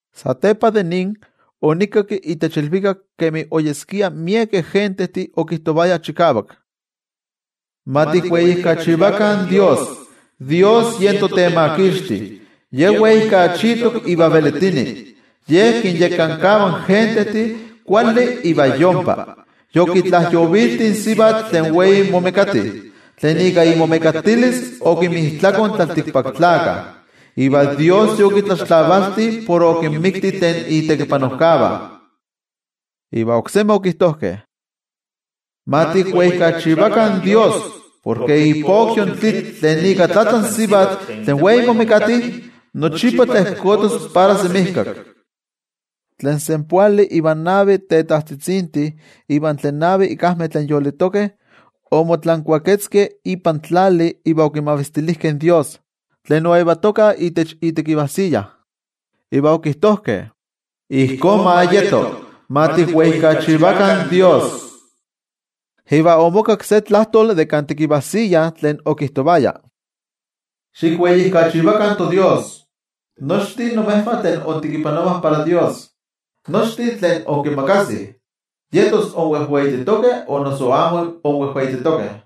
Satepa de nin, onikinkakki itech ilvikak kemi oyeskia miekeh gentejtih okijtovayah chikavak: ¡Ma tikweijkachivakah in Dios! Dios yen toTemakixti, Ye weijkachitok iva velitini. Ye kinyekankava in gentejtih kuali iva yompa. Yokitlajyovilti in sivatl tlen wei momekati, tlen ika imomekatilis okinmijtlako in tlaltikpaktlakah. Iva Dios yokitlaxtlavalti por okinmikti tlen itekipanojkavah. Iva okijtojkeh oksemi: —¡Ma tikweijkachivakah in Dios! Porke ipokyo in tlitl tlen ika tlatla in sivatl tlen wei momekati nochipa tlejkotos para semijkak. Tlen senpoali ivan navi tetajtzitzintih iva tlen navi ikajmeh tlen yolitokeh, omotlankuaketzkeh ipan tlali iva okimavistilijkeh in toYejwatzi, tlen oyetoka itech itekivajsiya. Iva okijtojkeh: —¡Ijkó ma yeto! ¡Ma tikweijkachivakah in Dios! Iva omokakki se tlajtoli de kan tekivajsiya tlen okijtovaya: Xikweijkachivakah in toDios, nochtin imejvah tlen intekipanovah para Dios, nochtin tlen inkimakasih, yetos inwejweititokeh o noso amo inwejweititokeh.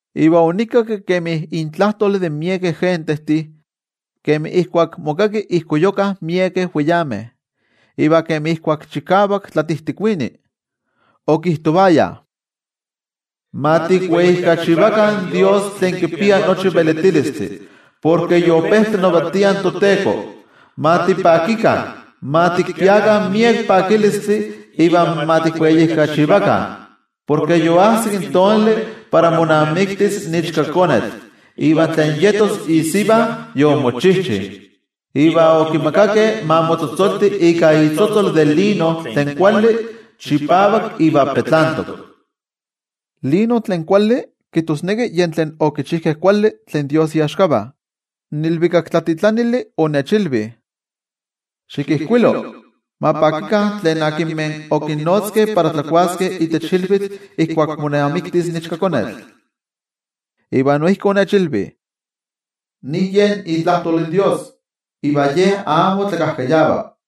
Iva onikakki kemi intlajtol de miekeh gentejtih, kemi ijkuak mokaki ijkoyukah miekeh weyameh iva kemi ijkuak chikavak tlatijtikuini. Okijtovayah: ¡Ma tikweijkachivakah in Dios tlen kipia nochi velitilistli! Porke yope tlanavatia in toTeko. Ma tipakikah, ma tikpiakah miek pakilistli iva ma tikweijkachivakah, porke yoajsik in tonali para monamiktis in Ichkakonetl, iva tlen yetos isiva yomochijchi. Iva okimakakeh ma motzotzolti ika itzotzol de lino tlen kuali, chipavak iva petlantok. Lino tlen kuali kijtosneki yen tlen okichijkeh kuali tlen toYejwatzi iaxkavah. In ilvikaktlatitlanili onechilvi: —Xikijkuilo: “Ma pakikah tlen okinnotzkeh para tlakuaskeh itech ilvitl ijkuak monamiktis in Ichkakonetl.” Iva noijki onechilvi: —Nin yen itlajtol in Dios, iva Ye amo tlakajkayava.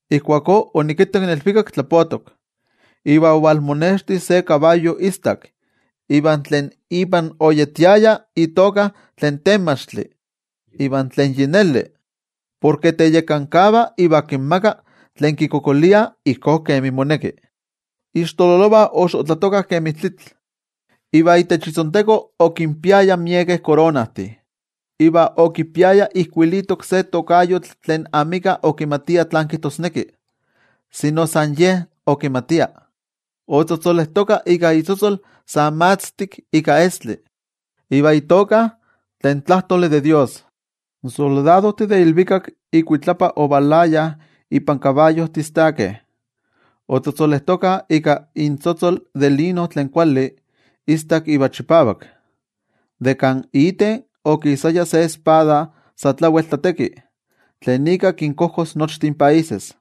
Ijkuakó onikittak in ilvikak tlapotok, iva ovalmonexti se kabayo istak. Iva tlen ipan oyetiaya itoka Tlen Temachtli iva Tlen Yi Neli. Porke teyekankava iva kinmaga ijkó kemi moneki tlen kikualankaitah. Ixtololovah oxotlatokah kemi tlitl, iva itech itzonteko okinpiaya miekeh koronajtih. Iva okipiaya ijkuilitok se tokayotl tlen amika okimatia tlán kijtosneki, sino san Ye okimatia. Otzotzolejtoka ika itzotzol sa matztik ika estli, iva itoka: Tlen Tlajtoli de toYejwatzi. In soldadojtih de ilvikak ikuitlapa ovalayah ipan kabayojtih istakeh, otzotzolejtokah ika intzotzol de lino tlen kuali, istak iva chipavak. De kan iten okisaya se espada sa tlawel tlateki, tlen ika kinkojkos nochtin países.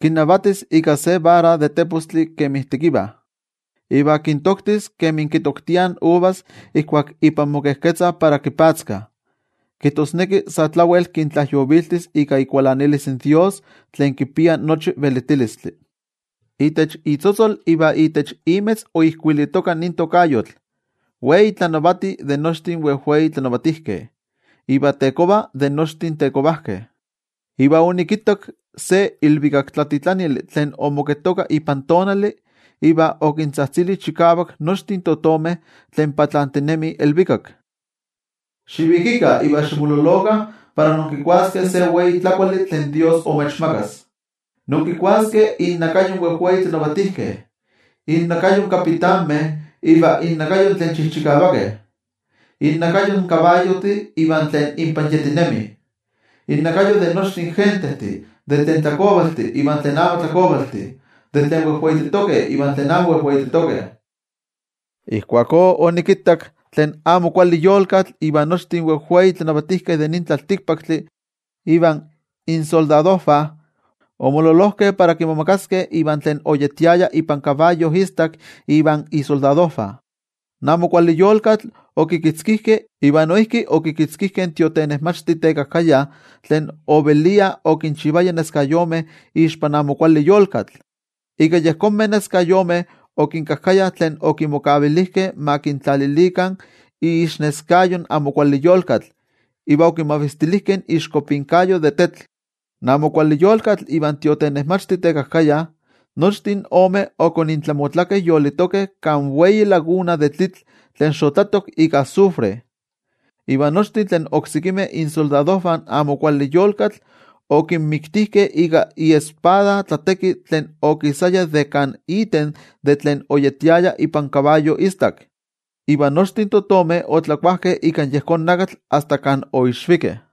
Kinnavatis ika se vara de tepostli kemi tekiva. Iva kintoktis kemi kitoktiah in uvas ijkuak ipan mokejketzah para mopatzka, kijtosneki sa tlawel kintlajyoviltis ika ikualanilis in toYejwatzi tlen kipia nochi velitilistli. Itech itzotzol iva itech imetz oijkuilitoka nin tokayotl: “Wei Tlanavati de nochtin wejwei tlatlanavatijkeh iva Tekova de nochtin tetekovajkeh.” Iva onikittak se ilvikaktlatitlanili tlen omoketoka ipan tonali iva okintzajtzili chikavak nochtin totomeh tlen patlantinemih ilvikak: —Xivikikah iva ximololokah para inkikuaskeh se wei tlakuali tlen Dios imechmakas. Inkikuaskeh innakayo in wejwei tlanavatijkeh, innakayo in kapitanmeh iva innakayo tlen chijchikavakeh, innakayo in kabayojtih iva tlen inpan yetinemih, innakayo de nochtin gentejtih, tlen tlakovaltih iva tlen amo tlakovaltih, tlen wejweititokeh iva tlen amo wejweititokeh. Ijkuakó onikittak tlen amo kuali yolkatl iva nochtin wejwei tlanavatijkeh de nin tlaltikpaktli invan insoldadojvah, omololojkeh para kimomagaskeh ivan tlen oyetiaya ipan kabayo istak ivan isoldadojvah. In amo kuali yolkatl okikitzkijkeh, iva noijki okikitzkijkeh in tiotenejmachti tekajkaya tlen ovelia okinchivaya tetzavkaneskayomeh ixpan amo kuali yolkatl. Ika yejonmeh tetzavkaneskayomeh okinkajkaya tlen okimokavilijkeh ma kintlalilikah iixneskayo in amo kuali yolkatl iva okimavistilijkeh iixkopinkayo de tetl. In amo kuali yolkatl ivan tiotenejmachti tekajkaya, nochtin omeh okonintlamotlakeh yolitokeh kan wei laguna de tlitl tlen xotlatok ika azufre. Iva nochtin tlen oksekimeh isoldadojvah in amo kuali yolkatl omikkeh ika iespada tlateki tlen okisaya de kan iten tlen oyetiaya ipan ikabayo istak. Iva nochtin totomeh otlakuajkeh ika yejón nakatl asta kan oixvikeh.